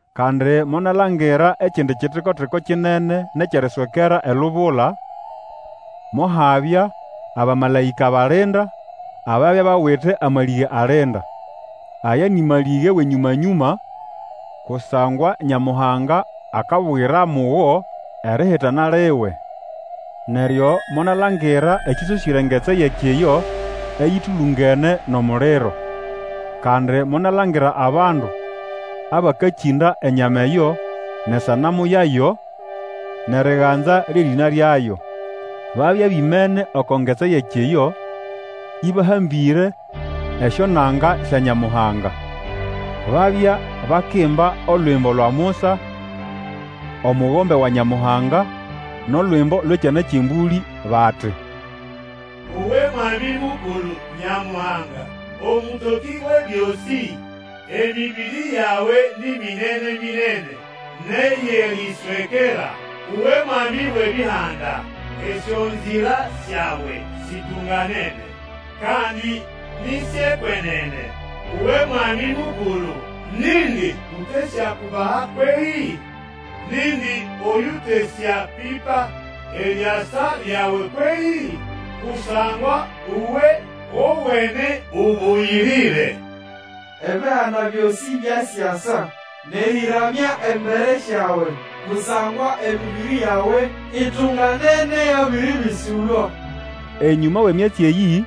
Kandi monalangira ekindi kitikotiko kinene nʼekyʼeriswekera elubula. Mohabya abamalaĩka balinda, ababya bawite amalĩge alinda. Aya nĩ malĩge wʼenyũma-nyũma, kusangwa Nyamuhanga akabugira mugo erihitana liwe. Neryo monalangira ekĩsosĩre engetsi yʼekiyo eyĩtũlũngene nʼomuliro. Kandi monalangira abandu abakĩnda enyama eyo nʼesanamu yayo, nʼeriganza lyʼerĩna lyayo. Babya bimene oko ngetsi yʼekiyo, ĩbahambĩre esyonanga sya Nyamuhanga. Babya bakimba Olwimbo lwa Musa, omugombe wa Nyamuhanga, nʼolwimbo lwʼEkyana kyʼEmbũlĩ, bati, Uwe Mwami Mukulu Nyamuhanga, Omũtokĩ Wʼebyosĩ, Emĩbĩrĩ yawe ni minene-minene, nʼeyʼeriswekera! Uwe Mwami wʼebihanda, Esyonzira syawe situnganene, kandi ni syʼekwenene! Uwe Mwami Mukulu nindi utesyakubaha kwehĩ? Nindi oyutesyapipa eriasa lyawe kwehĩ? Kusangwa uwe wowene ũbũyĩrĩre. Ebihanda byosĩ basyasa, Nʼerĩramya embere syawe, Kusangwa emĩbĩrĩ yawe itunganene yabĩrĩbĩsũlwa. Enyũma wʼemyatsi eyĩ,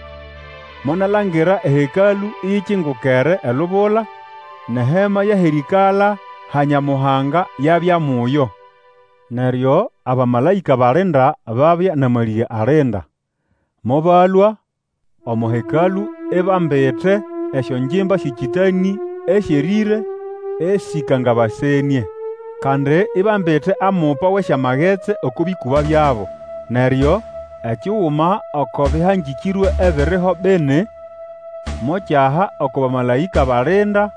monalangira eHekalũ iyikingukere elubula, nʼeHema yʼahʼerĩĩkala ha Nyamuhanga yabya muyo. Neryo abamalaĩka balinda ababya nʼamalĩge alinda, mobalũa omo Hekalũ, ibambite esyongimba syʼekĩtanĩ esyerĩre, esĩkangabasenĩe. Kandi ibambite amupa wʼesyamagetsi oko bĩkũba byabo. Neryo ekiguma oko bĩhangĩkĩrwe ebiriho bini mokyaha oko bamalaĩka balinda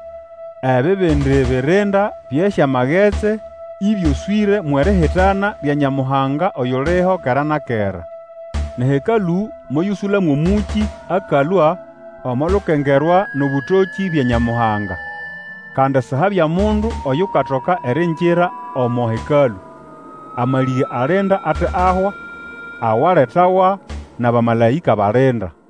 ebibindi birinda byʼesyamagetsi ĩbyoswĩre mwʼerihitana lya Nyamuhanga, oyuliho kera na kera. NʼeHekalũ moyũsũla mwʼomũkĩ akalũa omo lukengerwa nʼobũtokĩ bya Nyamuhanga. Kandi sihabya mundu oyukatoka eriingira omo Hekalũ, amalĩge alinda ate ahwa, awaletawa nʼabamalaĩka balinda.